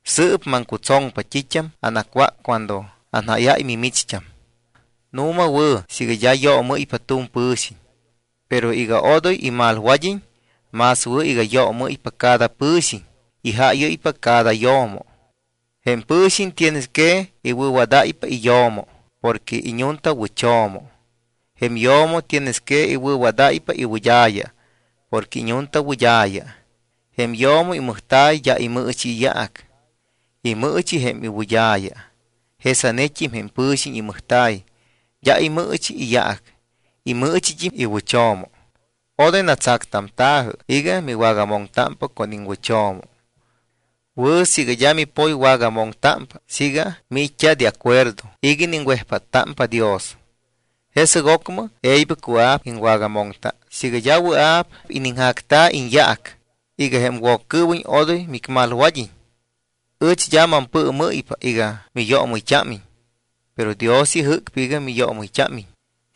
Sɨɨp maŋcutsoŋpa t́it́am anacwác cuando anjáyáy mimicht́am: Nu̱ma wɨ̱ siiga d́a yoomɨ́ypa tu̱m pɨ̱xiñ. Pero iga odoy immalwad́iñ, más wɨ̱ iga yoomɨ́ypa cada pɨ̱xiñ y jaayɨ́ypa cada yo̱mo. Jém pɨ̱xiñ tienes que iwɨ̱wadáypa iyo̱mo porque iñuntawɨcho̱mo. Jém yo̱mo tienes que iwɨ̱wadáypa iwɨd́a̱ya porque iñuntawɨd́a̱ya. Jém yo̱mo imɨjta̱y d́a imɨɨchi iyaac. Imɨɨchi jém iwɨd́a̱ya. Jesanet́im jém pɨ̱xiñ imɨjta̱y d́a imɨɨchi iyaac. Imɨɨchit́im jém iwɨcho̱mo. Odoy natsactamta̱jɨ iga miwagamoŋtámpa con iŋwɨcho̱mo. Wɨ̱ siiga d́a mipoywagamoŋtámpa siiga miit́t́a de acuerdo iga iniŋwejpáttámpa Dios. Jesɨc ocmɨ e̱ybɨct́im wɨa̱p iŋwagamoŋta, siiga d́a wɨa̱p iniŋjacta̱ iñyaac, iga jém Woccɨɨwiñ odoy micmalwad́iñ. Ɨch d́a mampɨɨmɨ́ypa iga miyoomɨyt́ámiñ, pero Dios ijɨ́cpa iga miyoomɨyt́ámiñ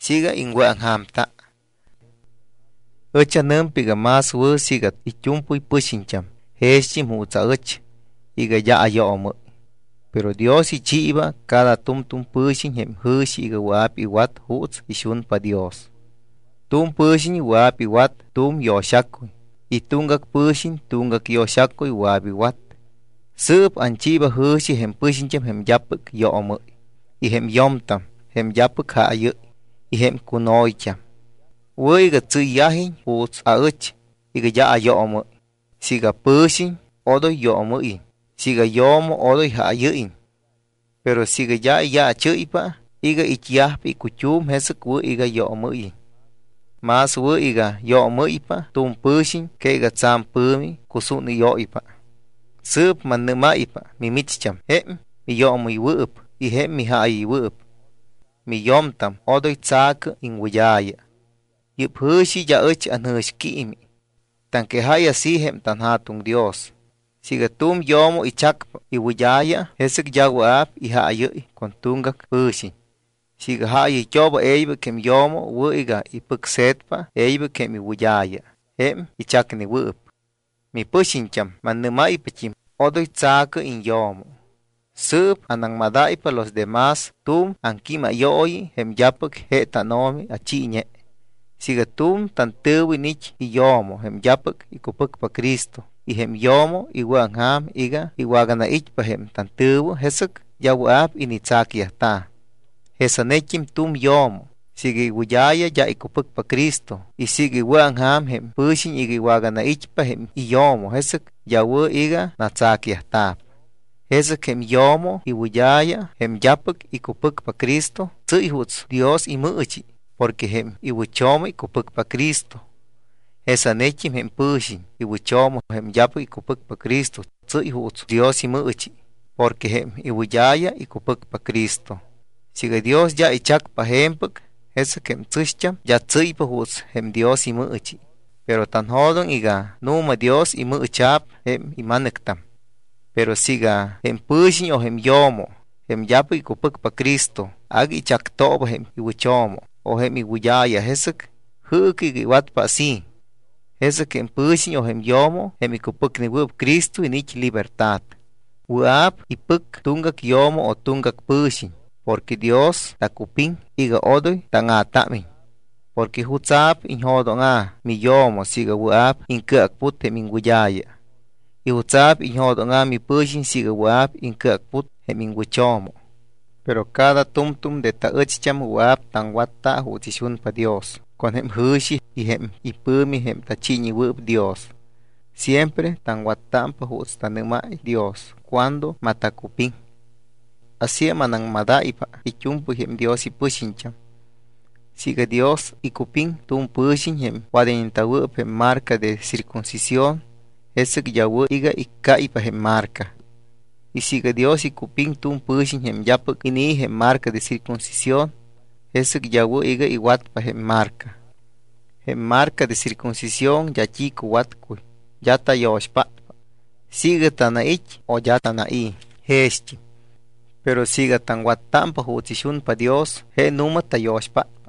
siiga iŋwɨ̱aŋja̱mta. Ɨch anɨmpa iga más wɨ̱ siiga it́u̱mpɨy pɨxiñt́am jext́im juuts aɨch iga d́a ayoomɨ́y. Pero Dios ichiiba cada tu̱m tu̱m pɨ̱xiñ jém jɨ̱xi iga wɨa̱p iwat juuts ixunpa Dios. Tu̱m pɨ̱xiñ wɨa̱p iwat tu̱m yo̱xacuy y tuŋgac pɨ̱xiñ tuŋgac yo̱xacuy wɨa̱p iwat. Sɨɨp anchiiba jɨ̱xi jém pɨxiñt́am jém d́apɨc yoomɨ́y y jém yo̱mtam jém d́apɨc jaayɨ́y y jém cuno̱yt́am: Wɨ̱ iga tsɨ́yyajiñ juuts aɨch iga d́a ayoomɨ́y. Siiga pɨ̱xiñ, odoy yoomɨ́yiñ. Siiga yo̱mo, odoy jaayɨ́yiñ. Pero siiga d́a iyaachɨ́ypa iga it́yajpa icut́um, jesɨc wɨ̱ iga yoomɨ́yiñ. Más wɨ̱ iga yoomɨ́ypa tu̱m pɨ̱xiñ que iga tsa̱m pɨ̱mi cusúnɨ́yóypa. Sɨɨp mannɨ́máypa mimicht́am, jém miyoomɨywɨɨp y jém mijaayɨywɨɨp: Miyo̱mtam odoy tsa̱cɨ iŋwɨd́a̱ya. Yɨ́p jɨ̱xi d́a ɨch anjɨ̱xquiimi. Taŋquejáy así jém tanJa̱tuŋ Dios. Siiga tu̱m yo̱mo ichacpa iwɨd́a̱ya, jesɨc d́a wɨa̱p ijaayɨ́y con tuŋgac pɨ̱xiñ. Siiga jaayɨyt́ooba e̱ybɨc jém yo̱mo, wɨ̱ iga ipɨcse̱tpa e̱ybɨc jém iwɨd́a̱ya jém ichacnewɨɨp. Mipɨxiñt́am, mannɨ́máypat́im: Odoy tsa̱cɨ iñyo̱mo. Sɨɨp anaŋmadáypa los de más tu̱m aŋquímayooyi jém d́apɨc je tánO̱mi achiiñe. Siiga tu̱m tantɨ̱wɨ iniit́ iyo̱mo jém d́apɨc icupɨcpa Cristo y jém yo̱mo iwɨ̱aŋja̱m iga iwaganait́pa jém tantɨ̱wɨ, jesɨc d́a wɨa̱p initsacyajta̱. Jesanet́im tu̱m yo̱mo siiga iwɨd́a̱ya d́a icupɨcpa Cristo y siiga iwɨ̱aŋja̱m jém pɨ̱xiñ iga iwaganait́pa jém iyo̱mo, jesɨc d́a wɨ̱ iga natsacyajta̱p. Jesɨc jém yo̱mo iwɨd́a̱ya, jém d́apɨc icupɨcpa Cristo, tsɨ́y juuts Dios imɨɨchi porque jém iwɨcho̱mo icupɨcpa Cristo. Jesanet́im jém pɨ̱xiñ iwɨcho̱mo, jém d́apɨc icupɨcpa Cristo, tsɨ́y juuts Dios imɨɨchi porque jém iwɨd́a̱ya icupɨcpa Cristo. Siiga Dios d́a ichacpa je̱mpɨc, jesɨc jém tsɨ̱xt́am d́a tsɨ́ypa juuts jém Dios imɨɨchi, pero tanjo̱doŋ iga nu̱ma Dios imɨɨcha̱p jém ima̱nɨctam. Pero siiga jém pɨ̱xiñ o jém yo̱mo, jém d́apɨc icupɨcpa Cristo, agui ichactooba jém iwɨcho̱mo o jém iwɨd́a̱ya, jesɨc jɨɨcɨ iga iwatpa así. Jesɨc jém pɨ̱xiñ o jém yo̱mo, jém icupɨcnewɨɨp Cristo, iniit́ libertad; wɨa̱p ipɨc tuŋgac yo̱mo o tuŋgac pɨ̱xiñ porque Dios tacupiŋ iga odoy táŋa̱támiñ. ¿Porque jutsa̱p iñjo̱dóŋa̱ miyo̱mo siiga wɨa̱p iŋcɨacput jém iŋwɨd́a̱ya? ¿Y jutsa̱p iñjo̱dóŋa̱ mipɨ̱xiñ siiga wɨa̱p iŋcɨacput jém iŋwɨcho̱mo? Pero cada tu̱mtu̱m de taɨcht́am wɨa̱p taŋwatta juuts ixunpa Dios con jém ijɨ̱xi y jém ipɨ̱mi jém tachiiñewɨɨp Dios. Siempre taŋwattámpa juuts tanɨ́máy Dios cuando matacupiŋ. Asíam anaŋmadayyajpa it́u̱mpɨy jém Dios ipɨxiñt́am. Siiga Dios icupiŋ tu̱m pɨ̱xiñ jém wadayñeta̱wɨɨp jém marca de circuncisión, jesɨc d́a wɨ̱ iga iccáypa jém marca. Y siiga Dios icupiŋ tu̱m pɨ̱xiñ jém d́apɨc inii̱ jém marca de circuncisión, jesɨc d́a wɨ̱ iga iwatpa jém marca. Jém marca de circuncisión d́a t́i cuwatcuy, d́a tayo̱xpátpa. Siiga tanait́ o d́a tanai̱ jext́im. Pero siiga taŋwattámpa juuts ixunpa Dios, je nu̱ma tayo̱xpátpa.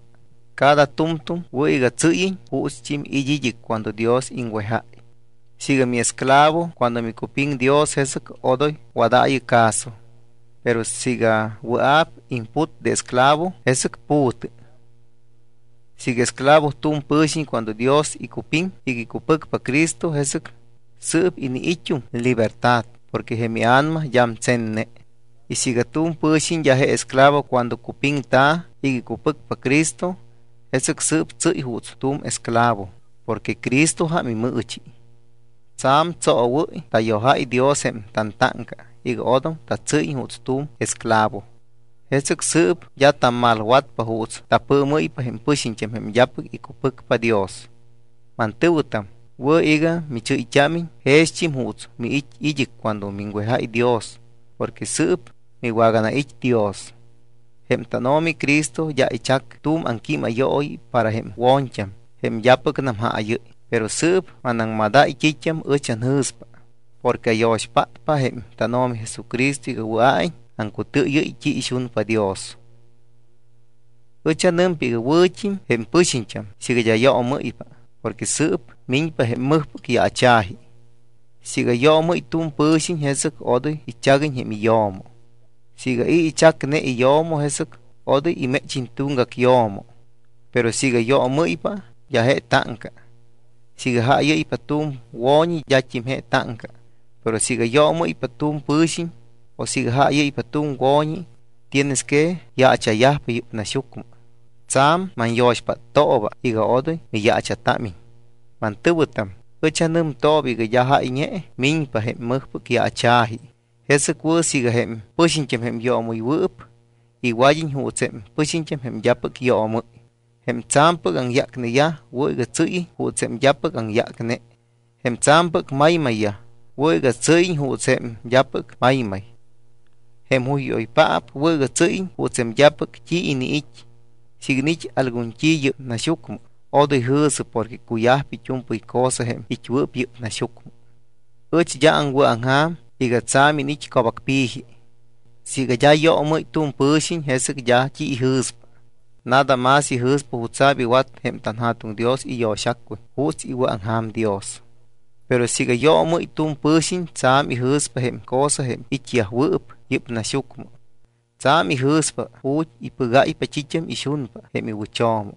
Cada tu̱mtu̱m wɨ̱ iga tsɨ́yiñ juutst́im it́ id́ɨc cuando Dios iŋwejáy. Siiga miesclavo cuando micupiŋ Dios, jesɨc odoy wadaayɨ caso. Pero siiga wɨa̱p imput de esclavo, jesɨc pu̱tɨ. Siiga esclavo tu̱m pɨ̱xiñ cuando Dios icupiŋ iga icupɨcpa Cristo, jesɨc sɨɨp iniit́um libertad porque jém ia̱nama d́am tsenne. Y siiga tu̱m pɨ̱xiñ d́a je esclavo cuando cupiŋta̱ iga icupɨcpa Cristo, jesɨc sɨɨp tsɨ́y juuts tu̱m esclavo porque Cristojam imɨɨchi. Tsa̱m tsoowɨ́y tayojáy Dios jém tantáŋca iga odom tatsɨ́yiñ juuts tu̱m esclavo. Jesɨc sɨɨp d́a tammalwatpa juuts tapɨɨmɨ́ypa jém pɨxiñt́am jém d́apɨc icupɨcpa Dios. Mantɨ̱wɨtam, wɨ̱ iga michɨ́yt́ámiñ jext́im juuts miit́ id́ɨc cuando miŋwejáy Dios porque sɨɨp miwaganait́ Dios. Jém tánO̱mi Cristo d́a ichac tu̱m aŋquímayooyi para jém wo̱ñt́am jém d́apɨcnam jaayɨ́y, pero sɨɨp manaŋmadáy t́it́am ɨch anjɨ̱spa porque ayo̱xpátpa jém tánO̱mi Jesucristo iga wɨa̱iñ aŋcutɨɨyɨ́y t́i ixunpa Dios. Ɨch anɨmpa iga wɨ̱t́im jém pɨxiñt́am siiga d́a yoomɨ́ypa porque sɨɨp miñpa jém mɨjpɨc yaacha̱ji. Siiga yoomɨ́y tu̱m pɨ̱xiñ, jesɨc odoy ichaguiñ jém iyo̱mo. Siiga i̱ ichacne iyo̱mo, jesɨc odoy iméchiñ tuŋgac yo̱mo. Pero siiga miyoomɨ́ypa, d́a je táŋca. Siiga jaayɨ́ypa tu̱m wo̱ñi, d́at́im je táŋca. Pero siiga yoomɨ́ypa tu̱m pɨ̱xiñ o siiga jaayɨ́ypa tu̱m wo̱ñi, tienes que yaacha̱yajpa yɨ́p naxyucmɨ. Tsa̱m manyo̱xpáttooba iga odoy miyaacha̱támiñ. Mantɨ̱wɨtam, ɨch anɨmtooba iga d́a jáyñe miñpa jém mɨjpɨc yaacha̱ji, jesɨc wɨ̱ siiga jém pɨxiñt́am jém yoomɨywɨɨp iwad́iñ juuts jém pɨxiñt́am jém d́apɨc yoomɨ́y. Jém tsa̱mpɨc aŋyácneyaj wɨ̱ iga tsɨ́yiñ juuts jém d́apɨc aŋyácne. Jém tsa̱mpɨc maymayyaj wɨ̱ iga tsɨ́yiñ juuts jém d́apɨc maymay. Jém juyjúyoypaap wɨ̱ iga tsɨ́yiñ juuts jém d́apɨc t́i iniit́. Siiga iniit́ algun t́i yɨ́p naxyucmɨ, odoy jɨ̱sɨ porque cuyajpa it́u̱mpɨy cosa jém it́wɨɨp yɨ́p naxyucmɨ. Ɨch d́a aŋwɨ̱aŋja̱m iga tsa̱m iniit́ co̱bacpi̱ji. Siiga d́a yoomɨ́y tu̱m pɨ̱xiñ, jesɨc d́a t́i ijɨ̱spa. Nada más ijɨ̱spa jutsa̱p iwat jém tanJa̱tuŋ Dios iyo̱xacuy juuts iwɨ̱aŋja̱m Dios. Pero siiga yoomɨ́y tu̱m pɨ̱xiñ, tsa̱m ijɨ̱spa jém cosa jém it́yajwɨɨp yɨ́p naxyucmɨ. Tsa̱m ijɨ̱spa ju̱t́ ipɨgáypa t́it́am ixunpa jém iwɨcho̱mo.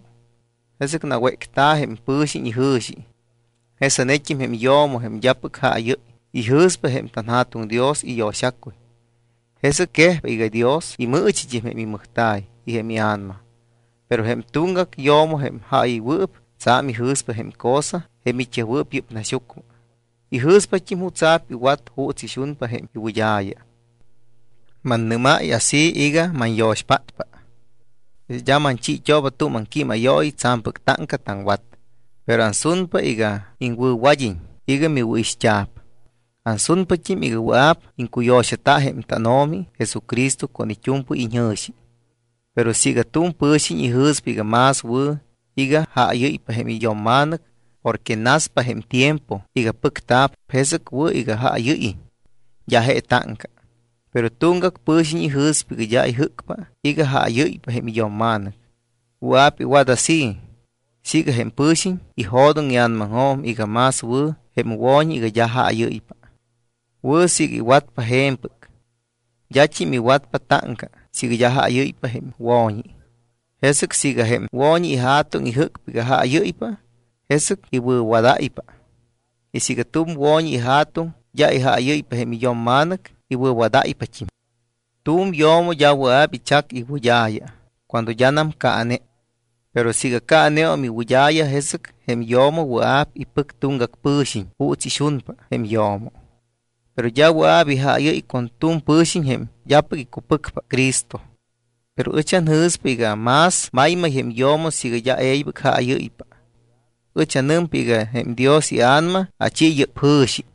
Jesɨc nawécta̱ jém pɨ̱xiñ ijɨ̱xi. Jesanet́im jém yo̱mo jém d́apɨc jaayɨ́y, ijɨ̱spa jém tanJa̱tuŋ Dios iyo̱xacuy. Jesɨc quejpa iga Dios imɨɨchit́im jém imɨjta̱y y jém ia̱nama. Pero jém tuŋgac yo̱mo jém jaayɨywɨɨp, tsa̱m ijɨ̱spa jém cosa jém it́yajwɨɨp yɨ́p naxyucmɨ. Ijɨ̱spat́im jutsa̱p iwat juuts ixunpa jém iwɨd́a̱ya. Mannɨ́máy así iga manyo̱xpátpa. D́a manchiit́ooba tu̱m aŋquímayooyi tsa̱mpɨc táŋca taŋwat. Pero ansunpa iga iŋwɨ̱wad́iñ iga miwɨ̱ixt́a̱p. Ansunpat́im iga wɨa̱p iŋcuyo̱xata jém tánO̱mi Jesucristo con it́u̱mpɨy iñjɨ̱xi. Pero siiga tu̱m pɨ̱xiñ ijɨ̱spa iga más wɨ̱ iga jaayɨ́ypa jém iyo̱mma̱nɨc porque naspa jém tiempo iga pɨcta̱p, jesɨc wɨ̱ iga jaayɨ́yiñ. D́a je táŋca. Pero tuŋgac pɨ̱xiñ ijɨ̱spa iga d́a ijɨ́cpa iga jaayɨ́ypa jém iyo̱mma̱nɨc. Wɨa̱p iwat así siiga jém pɨ̱xiñ ijo̱doŋ ia̱namaŋjo̱m iga más wɨ̱ jém wo̱ñi iga d́a jaayɨ́ypa. Wɨ̱ siiga iwatpa je̱mpɨc. D́at́im iwatpa táŋca siiga d́a jaayɨ́ypa jém wo̱ñi. Jesɨc siiga jém wo̱ñi ija̱tuŋ ijɨ́cpa iga jaayɨ́ypa, jesɨc iwɨ̱wadáypa. Y siiga tu̱m wo̱ñi ija̱tuŋ d́a ijaayɨ́ypa jém iyo̱mma̱nɨc, iwɨ̱wadáypat́im. Tu̱m yo̱mo d́a wɨa̱p ichac iwɨd́a̱ya cuando d́anam caane. Pero siiga caaneum iwɨd́a̱ya, jesɨc jém yo̱mo wɨa̱p ipɨc tuŋgac pɨ̱xiñ juuts ixunpa jém yo̱mo. Pero d́a wɨa̱p ijaayɨ́y con tu̱m pɨ̱xiñ jém d́apɨc icupɨcpa Cristo. Pero ɨch anjɨ̱spa iga más maymay jém yo̱mo siiga d́a e̱ybɨc jaayɨ́ypa. Ɨch anɨmpa iga jém Dios iA̱nama achi yɨ́p jɨ̱xi.